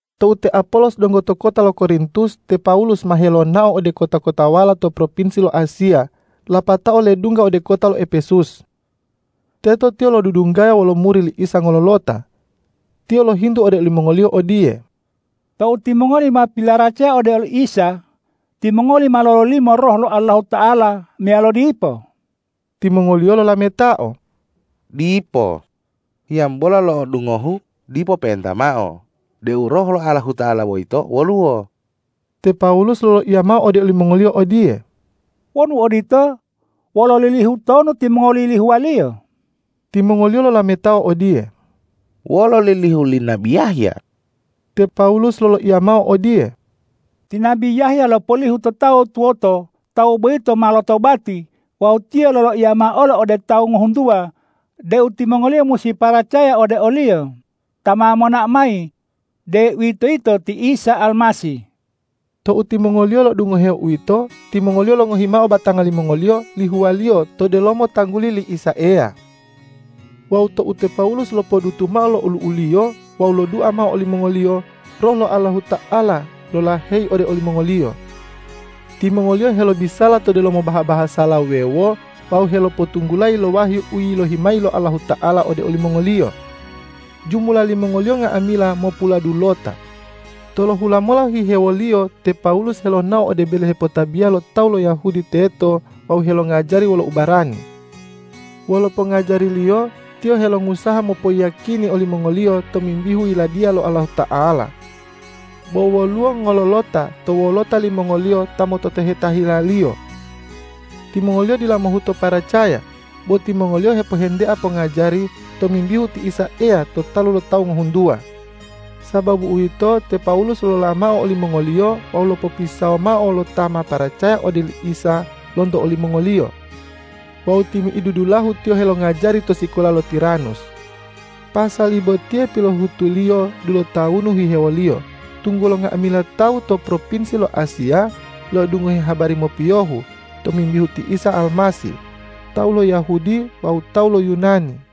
Tou te Apolos donggo to kota lo Korintus, te Pawulus ma helonao ode kota-kotawala to propinsi lo Asiya lapatao ledungga ode kota lo Epesus. Teto tiyo lodudunggaya wolo muri li Isa ngololota. Tiyo lohintu ode olimongoliyo odiye,”Tou timongoli ma pilaracaya ode oli Isa, timongoli ma lololimo Roh lo Allahuta'ala meyalo dipo?” Timongoliyo lolametao,”Dipo, hiyambola lo'odungohu dipo pe'enta mao deu Roh lo Allahuta'ala boyito woluwo.” Te Pawulus loloiya mao ode olimongoliyo odiye,”Wonu odito, wolo lilihu tonu timongoli yilihuwaliyo?” Timongoliyo lolametao odiye,”Wolo lilihu li nabi Yahya.” Te Pawulus loloiya mao odiye,”Ti nabi Yahya lopolihu to tawu tuwoto tawu boyito ma lotobati wawu tiyo loloiya mao olo ode tawu ngohuntuwa deu timongoliyo musi paracaya ode o-Liyo ta ma monao mayi, deuwitoyito ti Isa Almasih.” Tou timongoliyo lo'odungoheo uwito, timongoliyo longohi mao batanga limongoliyo lihuwaliyo to delomo tangguli li Isa Eya. Wawu tou te Pawulus lopodutu mao lo olu'uliyo wawu lodua mao olimongoliyo, Roh lo Allahuta'ala lolaheyi ode olimongoliyo. Timongoliyo helobisala to delomo baha-bahasala wuwewo wawu helopotunggulayi lo wahyu u yilohi mayi lo Allahuta'ala ode olimongoliyo. Jumula limongoliyo nga'amila mopuladulota. Tolohula mola hihewoliyo te Pawulus helonao ode bele hepotabiya lo tawu lo Yahudi teto wawu helongajari wolo ubarani. Wolo pongajariliyo tiyo helongusaha mopoyiyakini olimongoliyo tomimbihu Yiladiya lo Allahuta'ala. Bo woluwo ngololota to wolota limongoliyo ta mototoheta hilaliyo. Timongoliyo dila mohuto paracaya, bo timongoliyo hepohentea pongajari tomimbihu ti Isa Eya to talu lo tawu ngohuntuwa. Sababu uwito, te Pawulus lolola mao olimongoliyo wawu lopopisawo mao lo ta ma paracaya ode oli Isa lonto olimongoliyo. Wawu timi'idu dulahu tiyo helongajari to sikola lo Tiranus. Pasali botiye pilohutuliyo dulotawunu hihewoliyo, tunggulo nga'amila tawu to propinsi lo Asiya lo'odungohe habari mopiyohu tomimbihu ti Isa Almasih, tawu lo Yahudi wawu tawu lo Yunani.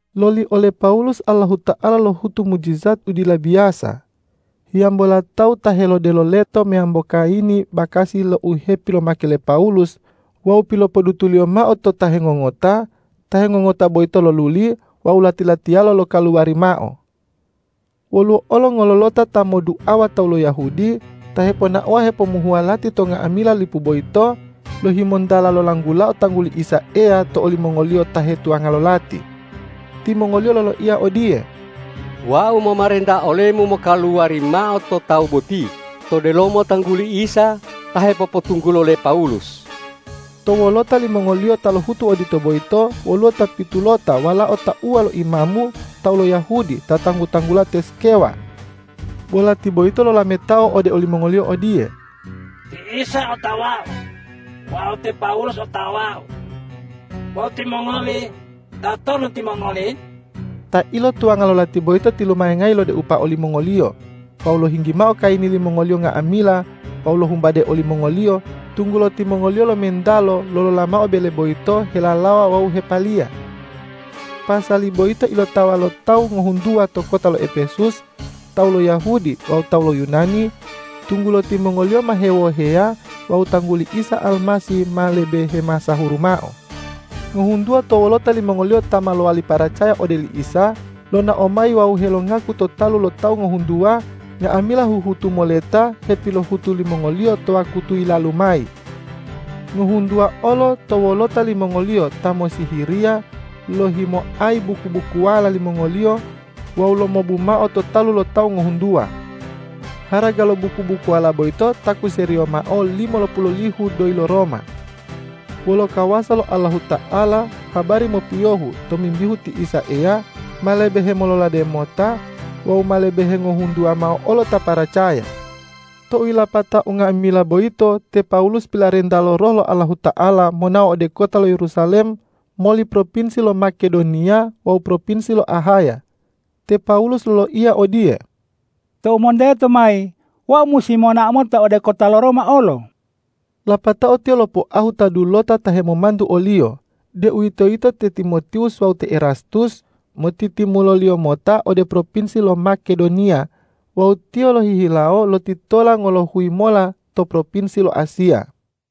Loli ole Pawulus Allahuta'ala lohutu mujijat u dila biyasa. Hiyambola tawu ta helodelo leto meyambo kayini bakasi lo u hepilomake le Pawulus wawu pilopodutuliyo mao to ta hengongota, ta hengongota boyito loluli wawu lati-latiyalo lokaluwari mao. Woluwo olo ngololota ta modduawa tawu lo Yahudi, ta heponaowa hepomuhuwa lati to nga'amila lipu boyito, lohimontala lolanggulao tangguli Isa Eya to olimongoliyo ta hetuwanga lo lati. Timongoliyo loloiya odiye,”Wau momarenta olemu mokaluwari mao to tawu boti to delomo tangguli Isa ta hepopotunggulo le Pawulus.” To wolota limongoliyo ta lohutu odito boyito, woluwo ta pitulota walao tauwa lo imamu tawu lo Yahudi ta tanggu-tanggula te Skewa. Bo lati boyito lolametao ode olimongoliyo odiye,”Ti Isa otawau wawu te Pawulus otawau. Bo timongoli, tatonu timongoli?” Ta ilotuwanga lo lati boyito tilumayangayi lodeupa olimongoliyo wawu lohinggi mao kayini limongoliyo nga'amila wawu lohumbade olimongoliyo, tunggulo timongoliyo lomentalo lolola mao bele boyito helalawa wawu hepaliya. Pasali boyito ilotawa lo tawu ngohuntuwa to kota lo Epesus, tawu lo Yahudi wawu tawu lo Yunani, tunggulo timongoliyo ma hewoheya wawu tangguli Isa Almasih ma lebe hemasahuru mao. Ngohuntuwa to wolota limongoliyo ta ma lowali paracaya ode oli Isa, lonao mayi wawu helongaku to talu lo tawu ngohuntuwa, nga'amila huhutu moleta hepilohutu limongoliyo to wakutu yilalu mayi. Ngohuntuwa olo to wolota limongoliyo ta mossihiriya lohimoayi buku-bukuwala limongoliyo wawu lomobu mao to talu lo tawu ngohuntuwa. Haraga lo buku-bukuwala boyito takuseriyo mao limolopulolihu doyi lo Roma. Wolo kawasa lo Allahuta'ala habari mopiyohu tomimbihu ti Isa Eya ma lebe hemololade mota wawu ma lebe hengohuntuwa mao olo ta paracaya. Tou yilapatao unga'amila boyito, te Pawulus pilarenta lo Roh lo Allahuta'ala monao ode kota lo Yerusalem moli propinsi lo Makedoniya wawu propinsi lo Ahaya. Te Pawulus loloiya odiye,”Tou monteto mayi, wau musi monao mota ode kota lo Roma olo.” Lapatao tiyo lopoahu ta dulota ta hemomantu oliyo, deuwitoyito te Timotiwus wawu te Erastus, motitimuloliyo mota ode propinsi lo Makedoniya wawu tiyo lohihilawo lotitola ngolohuyi mola to propinsi lo Asiya.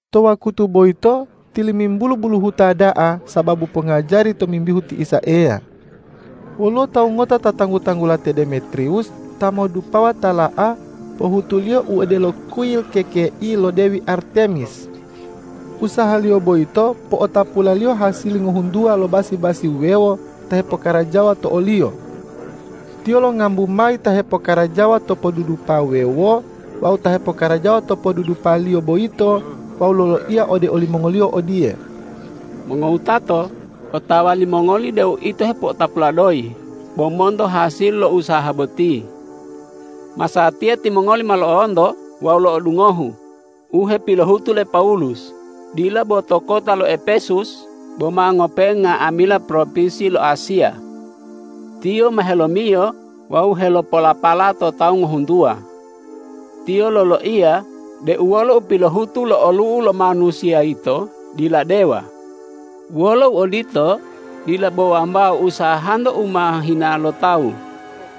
To wakutu boyito tilimimbulu buluhuta da'a sababu pongajari tomimbihu ti Isa Eya. Woluwo tawu ngota ta tanggu-tanggula te Demetriwus ta modupawa tala'a pohutuliyo u odelo kuyil kekei lo dewi Artemis. Usahaliyo boyito po'otapulaliyo hasili ngohuntuwa lo basi-basi wuwewo ta hepokarajawa to oliyo. Tiyo longambu mayi ta hepokarajawa to podudupa wuwewo wawu ta hepokarajawa to podudupaliyo boyito wawu loloiya ode olimongoliyo odiye,”Mongowutato, otawa limongoli deu ito hepo'otapula doyi bo monto hasili lo usaha boti! Masatiya timongoli ma lo'onto wawu lo'odungohu u hepilohutu le Pawulus, dila bo to kota lo Epesus, bo ma ngope'e nga'amila propinsi lo Asiya. Tiyo ma helomiyo wawu helopolapala to tawu ngohuntuwa. Tiyo loloiya deu wolo u pilohutu lo olu'u lo manusiya yito dila dewa. Wolo uodito, dila bo wambao usahanto u ma hina lo tawu,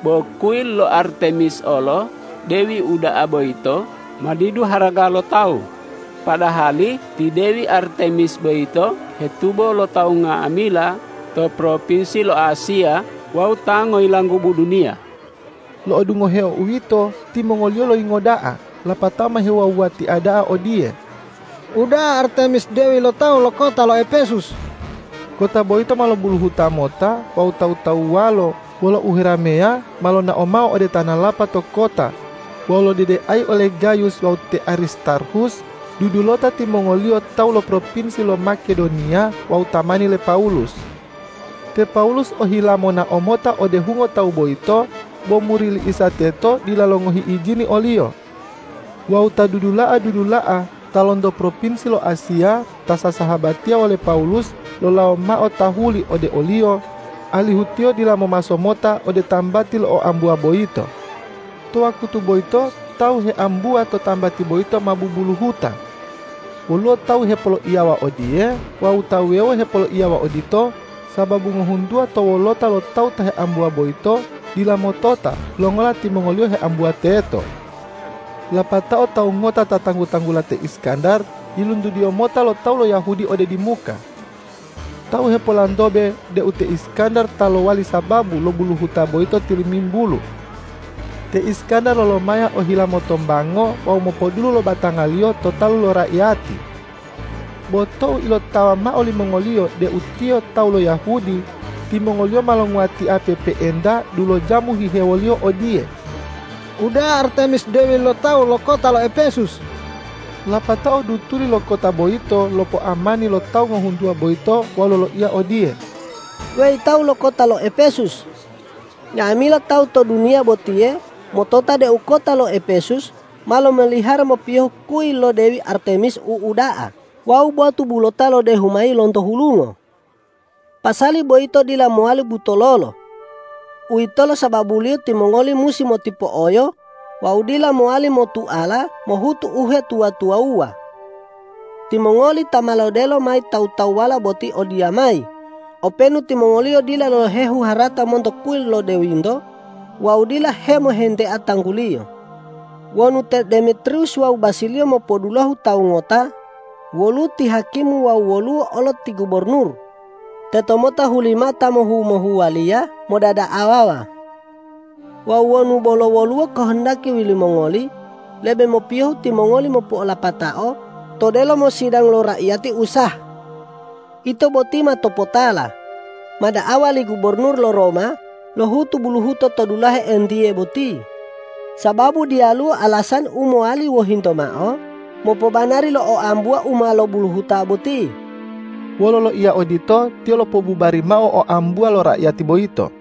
bo kuyil lo Artemis olo dewi uda'a boyito ma didu haraga lo tawu, padahali ti dewi Artemis boyito hetubo lo tawu nga'amila to propinsi lo Asiya wawu ta ngoyilanggubu duniya!” Lo'odungoheo uwito, timongoliyo loyingo da'a lapatao ma hewuwa-wuwatia da'a odiye,”Uda'a Artemis dewi lo tawu lo kota lo Epesus!” Kota boyito ma lobuluhuto lomota wawu tawu-tawuwalo wolo uherameya ma lonao mao ode tanalapa to kota wawu lodedeayi ole Gayus wawu te Aristarhus, dudulota timongoliyo tawu lo propinsi lo Makedoniya wawu tamani le Pawulus. Te Pawulus ohila monao mota ode hungo tawu boyito, bo muri li Isa teto dila longohi ijini oliyo. Wawu ta dudula'a-dudula'a ta lonto propinsi lo Asiya ta sasahabatiya wole Pawulus, lolawo mao tahuli ode oliyo, alihu tiyo dila momaso mota ode tambati lo oambuwa boyito. To wakutu boyito tawu heambuwa to tambati boyito ma bubuluhuta. Woluwo tawu hepoloiyawa odiye wawu ta wuwewo hepoloiyawa odito, sababu ngohuntuwa to wolota lo tawu ta heambuwa boyito dila motota longola timongoliyo heambuwa teto. Lapatao tawu ngota ta tanggu-tanggula te Iskandar yiluntudiyo mota lo tawu lo Yahudi ode dimuka. Tawu hepolantobe deu te Iskandar ta lowali sababu lo buluhuta boyito tilimimbulu. Te Iskandar lolomaya ohila motombango wawu mopodulu lo batangaliyo to talu lo raiyati. Bo tou ilotawa mao limongoliyo deu tiyo tawu lo Yahudi, timongoliyo ma longuwatia pe'epe'enta dulojamu hihewoliyo odiye,”Uda'a Artemis dewi lo tawu lo kota lo Epesus!” Lapatao dulutuli to kota boyito lopoamani lo tawu ngohuntuwa boyito wawu loloiya odiye,”Weyi tawu lo kota lo Epesus! Nga'amila tawu to duniya botiye motota deu kota lo Epesus ma lomalihara mopiyohu kuyil lo dewi Artemis u uda'a wawu botu bulota lodehu mayi lonto hulungo. Pasali boyito dila mowali butololo. Uwitolo sababuliyo timongoli musi motipo'oyo wawu dila mowali motuala mohutu uhetuwa-tuwawuwa. Timongoli ta ma lodelo mayi tawu-tawuwala boti odiyamayi, openu timongoliyo dila lohehu harata monto kuyil lo dewinto wawu dila hemohentea tangguliyo. Wonu te Demetriwus wawu basiliyo mopodulohu tawu ngota, woluwo ti hakimu wawu woluwo olo ti gubornur, tetomota hulimao ta mohu-mohuwaliya modada'awawa. Wawu wonu bolo woluwo kahandaki limongoli, lebe mopiyohu timongoli mopo'olapatao to delomo sidang lo raiyati u sah. Ito boti ma topotala, ma da'awa li gubornur lo Roma lohutu buluhuto to dulahe entiye boti, sababu diyaluwo alasani u mowali wohinto mao mopobanari lo oambuwa u ma lobuluhuta boti.” Wolo loiya odito tiyo lopobubari mao oambuwa lo raiyati boyito.